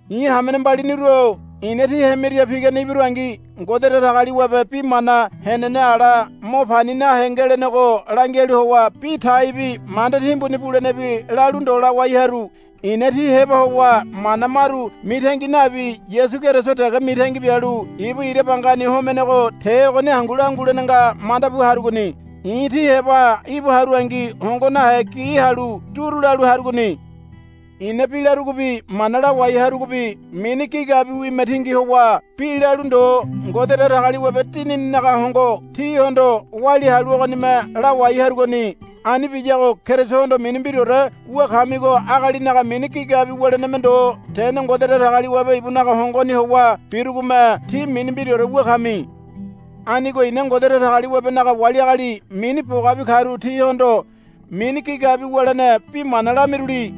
I̱ hamene mbaliniru-o i̱na tí hemiria pigane ibirungi Ngode Datagaliwabe bi mana henene ala mo pani nahe ngelenego langialu howa bi taibi manda timbuni bulenebi lalu ndo lawai haru. I̱na tí heba howa mana maru mitangi nabi Yasu Keriso dege mitangi bialu ibu ira bangani homenego te ogoni hangu langulene nga manda bu harugoni. I̱ tí heba íbu harungi hongo nahe gi halu duru lalu harugoni. I̱na bi larugobi mana lawai harugobi mini gigabiwime tingi howa bi lalu ndo Ngode Datagaliwabe Dinininaga hongo tíhondo walia halu ogonime lawai harugoni. Ani biyago Kerisohondo mini mbiraore wu kamigo agalinaga mini gigabi wuleneme ndo tene Ngode Datagaliwabe ibunaga hongoni howa birugome tí mini mbiraore wu kami. Anigo i̱na Ngode Datagaliwabenaga wali agali mini bogabi karu tihondo mini gigabi wulene bi mana lamiruli.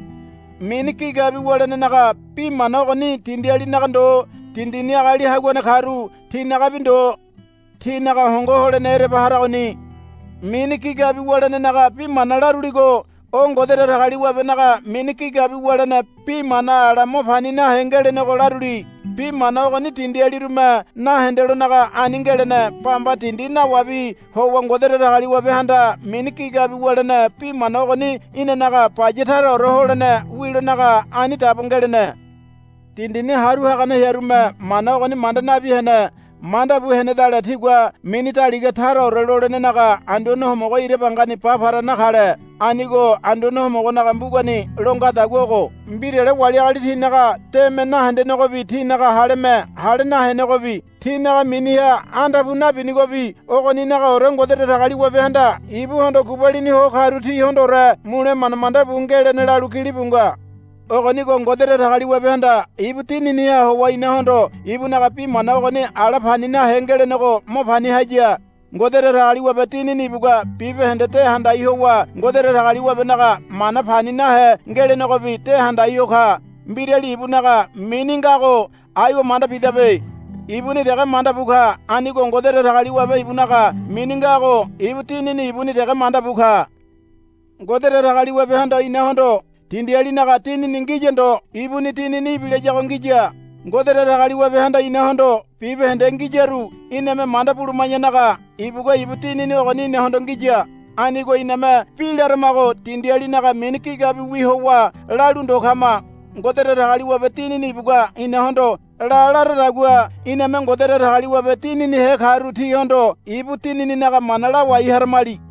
Mini gigabi wulenenaga bi mana ogoni dindialinaga ndo dindini agali haguane karu tinagabi ndo. Tinaga hongo holene ereba haragoni. Mini gigabi wulenenaga bi mana laruligo o Ngode Datagaliwabenaga mini gigabi wulene bi mana ala mo pani nahe ngelenego laruli. Bi mana ogoni dindialirume nahendelonaga ani ngelene. Bamba dindi nawabi howa Ngode Datagaliwabehanda mini gigabi wulene bi mana ogoni inanaga baya taraore holene wilonaga ani dabo ngelene. Dindini haru hagane hearume mana ogoni manda nabi hene. Manda bu henedale tigua mini daliga taraore lolenenaga Anduane Homogo ira bangani ba para nakale. Anigo Anduane Homogonaga mbugani lo ngadagua ogo, Mbirale wali agali tinaga deme nahendenegobi tinaga haleme hale nahenegobi tinaga miniha andape nabinigobi ogoninagaore Ngode Datagaliwabehanda ibuhondo gubalini ho karu tihondoore mule manda manda bu ngelene, lalu gilibu nga. Ogonigo Ngode Datagaliwabehanda ibu Dininiha howa inahondo ibunaga bi mana ogoni ala pani nahe ngelenego mo pani haya. Ngode Datagaliwabe Dinini ibugua bibahende de handai howa Ngode Datagaliwabenaga mana pani nahe ngelenegobi de handai ho ka. Mbirali ibunaga mini ngago aiwa manda bidabe. Ibuni dege manda bu ka. Anigo Ngode Datagaliwabe ibunaga mini ngago ibu Dinini ibuni dege manda bu ka. Ngode Datagaliwabehanda inahondo dindialinaga dinini ngiya ndo ibuni Dinini ibilayago ngiya. Ngode Datagaliwabehanda inahondo bibahende ngiyaru iname manda buluma̱yanaga ibugua ibu Dinini ogoni inahondo ngiya. Anigo iname bi laramago dindialinaga mini gigabiwi howa lalu ndo kama. Ngode Datagaliwabe Dinini ibugua inahondo, La, laradagua iname Ngode Datagaliwabe Dininihe karu tihondo ibu Dinininaga mana lawai haramali.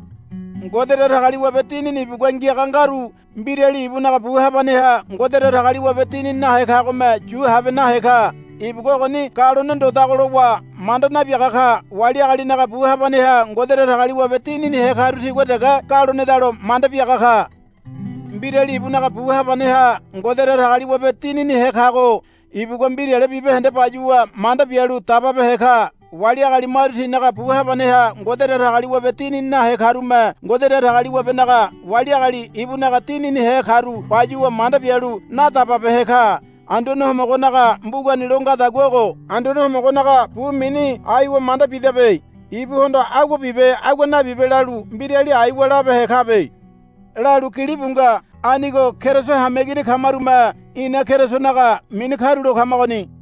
Ngode Datagaliwabe Dinini ibugua ngiaga ngaru mbirali ibunaga bu habaneha Ngode Datagaliwabe Dinini nahe kagome yu habe nahe ka. Ibugua ogoni galone ndodago lowa manda nabiaga ka. Wali agalinaga bu habaneha Ngode Datagaliwabe Dininihe karu tigua dege galonedalo manda biaga ka. Mbirali ibunaga bu habaneha Ngode Datagaliwabe Dininihe kago ibugua mbirale bibahende bayuwa manda bialu dababehe ka. Wali agali maru tinaga bu habaneha Ngode Datagaliwabe Dinini nahe karume Ngode Datagaliwabenaga wali agali ibunaga Dininihe karu bayuwa manda bialu nadababehe ka. Anduane Homogonaga mbugani lo ngadagua ogo, Anduane Homogonaga bu mini aiwa manda bidabe. Ibuhondo, Agua bibe agua nabibe, lalu mbirali aiwa labehe kabe, lalu gilibu nga. Anigo Keriso hameigini kamarume ina Kerisonaga mini karulo kamagoni.